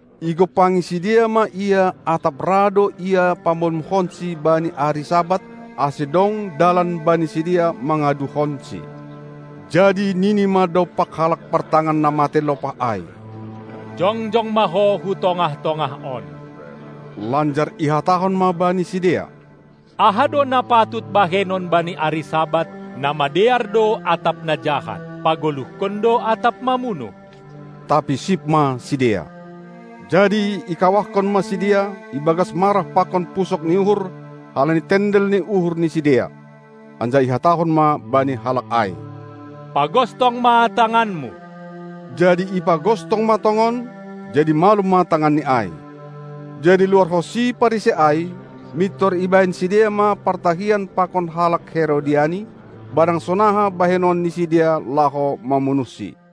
Igompangi sidea ma Ia atap ra do Ia pamalumkonsi bani ari Sabat, ase dong dalan bani sidea mangaduhonSi. Jadi nini ma dompak halak partangan na matei lopah ai: Jongjong ma ho hu tongah-tongah on! Lanjar ihatahon ma bani sidea: Aha do na patut bahenon bani ari Sabat, na madear do atap na jahat, pagoluhkon do atap mamunuh? Tapi sip ma sidea. Jadi ikawahkon ma sidea ibagas marah pakon pusok ni uhur halani tendel ni uhur ni sidea. Anjaha ihatahon ma bani halak ai: Pagostong ma tanganmu! Jadi ipagostong ma tongon, jadi malum ma tanganni ai. Jadi luarhonsi Parisei ai, mintor ibahen sidea ma partahian pakon halak Herodiani, barang sonaha bahenon ni sidea laho mamunuhSi.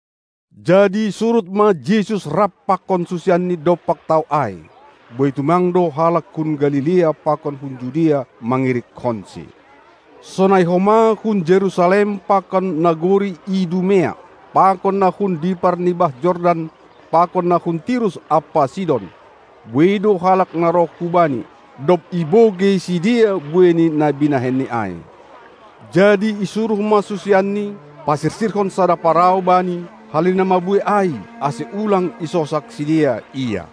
Jadi surut ma Jesus rapkon susianNi dompak tao ai. Buei tumang do halak hun Galilea pakon hun Judea mangirikkonSi, sonai homa hun Jerusalem pakon nagori Idumea pakon na hun dipar ni bah Jordan pakon na hun Tirus ampa Sidon; buei do halak na roh hu Bani, dob ibogei sidea buei ni na binahenNi ai. Jadi isuruh ma susianNi pasirsirhon sada parau Bani halani na mabuei ai, ase ulang isosak sidea Ia.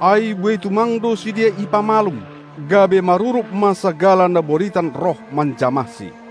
Ai buei tumang do sidea ipamalum, gabe marurup ma sagala na boritan roh manjamahSi.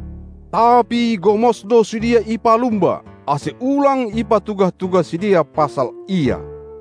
Tapi gomos do sidea ipalumba, ase ulang ipatugah-tugah sidea pasal Ia.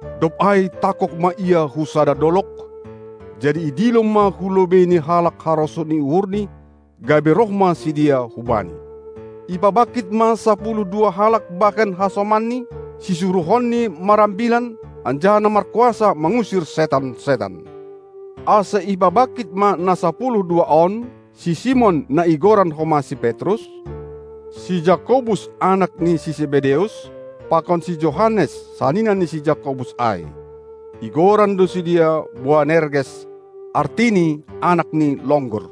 Dob ai tangkog ma Ia hu sada dolog, jadi idilo ma hu lobeiNi halak harosuh ni uhurNi, gabe roh ma sidea hu Bani. Ipabangkit ma sapuluh dua halak bahen hasomanNi, sisuruhonNi marambilan, anjaha na markuasa mangusir setan-setan. Ase ipabangkit ma na sapuluh dua on: Si Simon na igoran homa si Petrus; si Jakobus, anak ni si Sebedeus, pakon si Johannes, sanina ni si Jakobus ai. Igoran do sidea Boanerges, artini: anak ni longgur.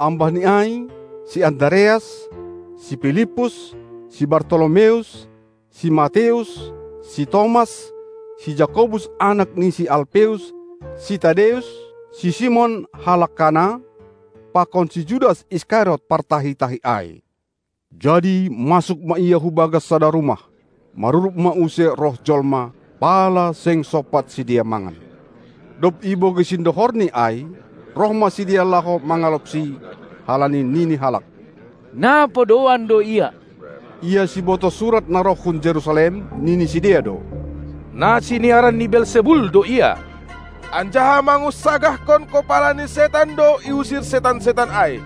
Ambah ni ai si Andareas, si Pilippus, si Bartolomeus, si Mateus, si Tomas, si Jakobus anak ni si Alpeus, si Tadeus, si Simon halak Kana, pakon si Judas Iskariot, partahi-tahi ai. Jadi masuk ma Ia hubagas sada rumah. Marurup ma use roh jolma, pala seng sompat sidea mangan. Dob ibogei sindohorni ai, roh ma sidea laho mangalopSi, halani nini halak: Na podouan do Ia. Ia sibotoh surat na roh hun Jerusalem, nini sidea do: Na siniaran ni Belsebul do Ia, anjaha mangunsagahkon kopala ni setan do iusir setan-setan ai.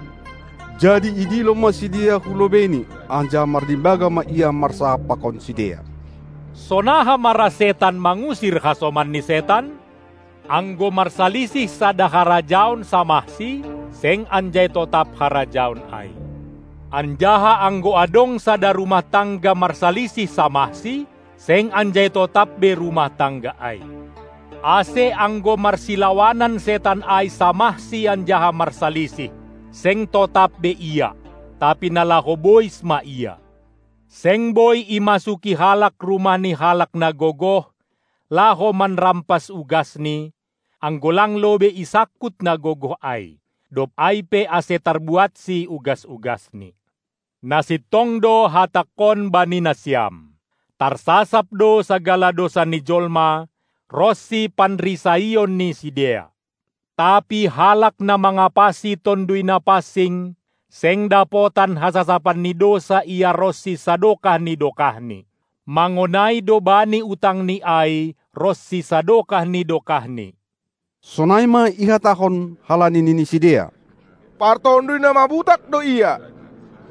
Jadi idilo ma sidea hu lobeiNi, anjaha marlimbaga ma Ia marsahap pakon sidea: Sonaha ma ra setan mangusir hasomanni setan? Anggo marsalisih sada harajaon samahsi, seng anjai totap harajaon ai. Anjaha anggo adong sada rumah tangga marsalisih samahsi, seng anjai totap be rumah tangga ai. Ase anggo marsilawanan setan ai samahsi anjaha marsalisih, seng totap be ia, tapi na laho bois ma ia. Seng boi imasuki halak rumah ni halak na gogoh, laho manrampas ugasni, anggo lang lobei isangkut na gogoh ai; dob ai pe ase tarbuatsi ugas-ugasni. Na sintong do hatangkon bani nasiam: Tarsasap do sagala dousa ni jolma, ronsi panrisaion ni sidea; tapi halak na mangapasi Tonduy Napansing, seng dapotan hasasapan ni dousa ia ronsi sadokah ni dokahni; mangonai do bani utangni ai ronsi sadokah ni dokahni. Sonai ma ihatahon, halani nini sidea: Partonduy na mabutak do Ia.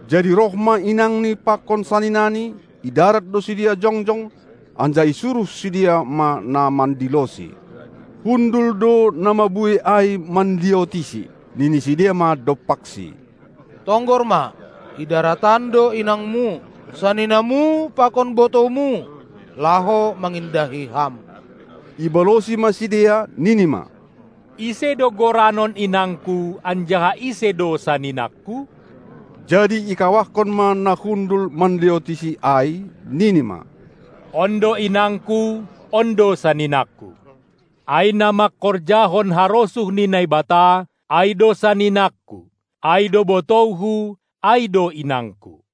Jadi roh ma inangNi pakon saninaNi, i darat do sidea jongjong, anjaha isuruh sidea ma na mandiloSi. Hundul do na mabuei ai manliotiSi, nini sidea ma dompakSi: Tonggor ma, i darat an do inangMu, saninaMu pakon botouMu, laho mangindahi Ham! Ibalosi ma sidea, nini ma: Ise do goranon inangKu anjaha ise do saninang-saninangKu? Jadi ikawahkon ma na hundul manliotiSi ai, nini ma: On do inangKu, on do saninang-saninangKu! Ai na mangkorjahon harosuh ni Naibata, ai do saninangKu, ai do botouHu, ai do inangKu!